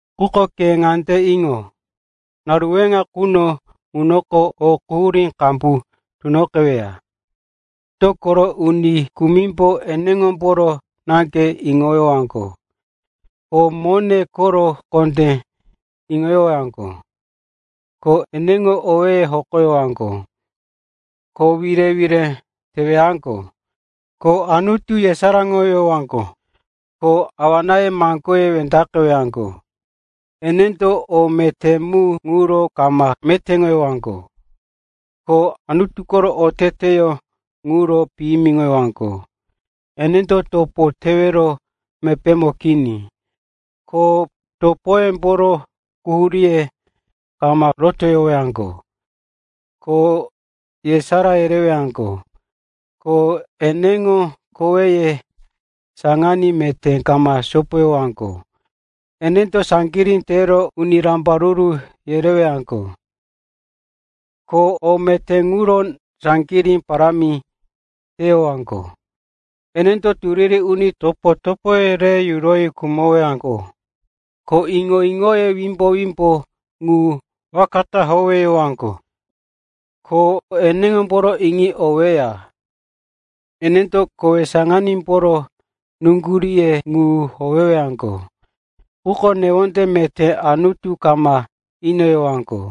Quko ke ŋande iŋo. Naru weŋa quno ŋunoko o quhurí qambu tunoqeweya. Dokoro uni kumimbo eneŋomboro naŋge iŋoyowaŋgo, ko mone koro kondé iŋoyowaŋgo, ko eneŋo owéye hokoyowaŋgo, ko wire-wire teyowaŋgo, ko Anutu yesaráŋoyowaŋgo, ko awa-náye maŋgoye wendaqeyowaŋgo. Enendo o meté mu ŋuro kama metéŋoyowaŋgo, ko Anutu koro oteteyó ŋuro piyimiŋowaŋgo. Enendo topo tewero mepémo kini, ko topoyemboro quhuríye kama rotoyowaŋgo, ko yesará yereyowaŋgo, ko eneŋo koweye saŋaní meté kama sopoyowaŋgo. Enendo saŋgirí tero uni rambaruru yereyowaŋgo, ko o meté ŋuro saŋgirí parámi tewaŋgo. Enendo turiri uni topo-topoye re yunoyi yurowaŋgo, ko iŋo-iŋoye wimbo-wimbo ŋu waka ta howeyowaŋgo, ko enemboro iŋi oweya. Enendo kowe saŋanímboro nuŋguríŋo ŋu howewaŋgo, quko newonde meté Anutu kama inoyowaŋgo.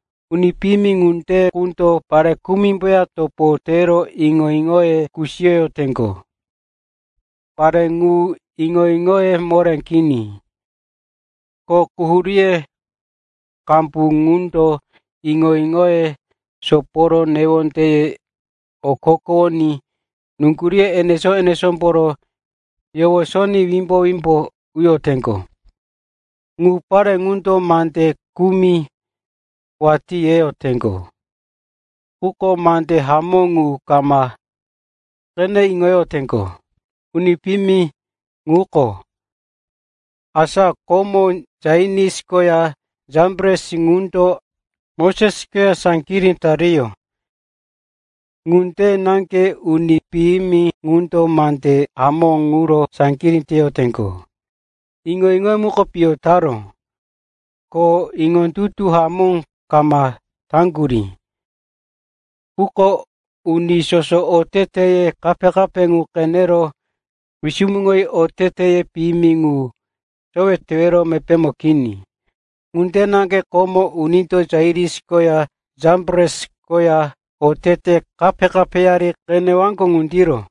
Dokoro uni piyimi ŋunde qundo pare kumimboya topo tero iŋo-iŋoye kusiyoyoteŋgo. Pare ŋu iŋo-iŋoye moré kini, ko quhuríye qambu ŋundo iŋo-iŋoye soporo newondeye okokowoní nuŋguríye enesó-enesómbo yowosoní wimbo-wimbo uyoteŋgo. Ŋu pare ŋundo mande kumi watí reyoteŋgo, quko mande hamó ŋu kama qene iŋoyoteŋgo. Uni piyimi ŋuko, asa komo Janis koya Jambres ŋundo Moses koya saŋgirí tariyó, ŋunde naŋge uni piyimi ŋundo mande hamó ŋuro saŋgirí teyoteŋgo. Iŋo-iŋoye muko piyo taró, ko iŋondutu hamó kama taŋgurí. Quko uni soso oteteye kape-kape ŋu qenero wisumuŋoyi oteteye piyimi ŋu sowe tewero mepémo kini. Ŋunde naŋge komo unindo Janis koya Jambres koya otete kape-kapeyari qeneyaŋgo ŋundiro.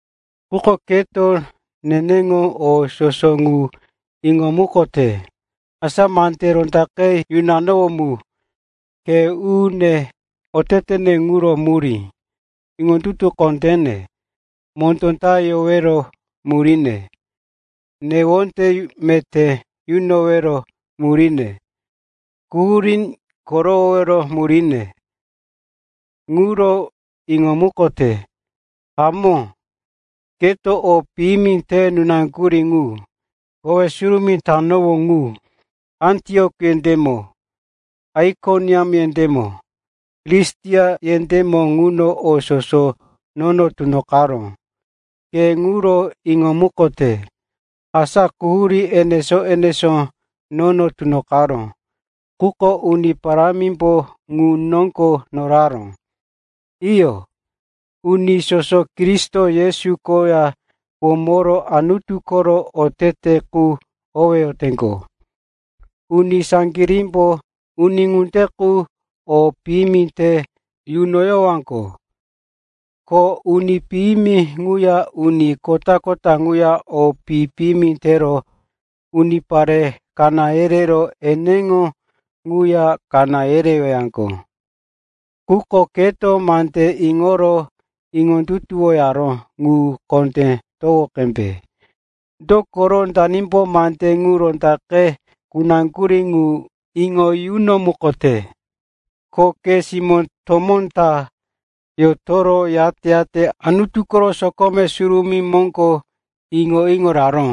Quko keto neneŋo o soso ŋu iŋomukote, asa mande rondaqe yunanowó mu, khe u-une, otetene ŋuro murí, iŋondutu kondéne, mondó ta yowero muríne, newonde meté yunowero muríne, quhurí korowowero muríne, ŋuro iŋomukote. Hamó, keto o piyimi te nunaŋgurí ŋu, kowe surumí tanowó ŋu, Antiok yendémo, Aikoniam yendémo, Listira yendémo ŋuno o soso nono tunoqaró, ke ŋuro iŋomukote. Asa quhurí enesó-enesó nono tunoqaró, quko Uni Parámimbo ŋu noŋgo noraró. Iyo, uni soso Kristo Yesu koya womoro Anutu koro otete qu howeyoteŋgo, uni saŋgirímbo uni ŋunde qu o piyimi te yunoyowaŋgo. Ko uni piyimi ŋuya uni kota-kota ŋuya o pi-piyimi tero unipare kaná yerero eneŋo ŋuya kaná yerewaŋgo. Quko keto mande iŋoro iŋondutuwoyaró ŋu kondé towo qembe. Dokoro danimbo mande ŋu rondaqe kunaŋgurí ŋu iŋo yunomukote, ko ke simó tomó ta yotoro, yate-yate Anutu koro sokome surumí moŋgo iŋo-iŋo raró.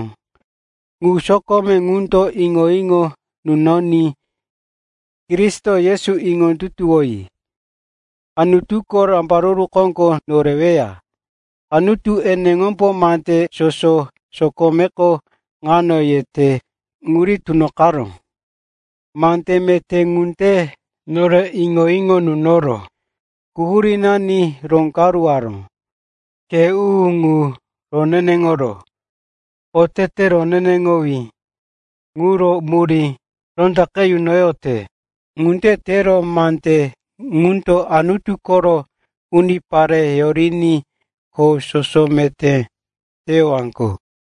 Ŋu sokome ŋundo iŋo-iŋo kunoní, Kristo Yesu iŋondutuwoyi, Anutuko rambaruru koŋgo koreweya. Anutu eneŋombo mande soso sokomeko ŋuno yote qu riní tunoqaró. Mande meté ŋundo nore iŋo-iŋo yunoro, quhurínani roŋgaruworo, khe u-unani ŋu roneneŋoro, otete roneneŋowí ŋuro murí rondaqe yunoyote. Ŋunde tero mande ŋundo Anutu koro unipare yoriní kho soso meté teyowaŋgo.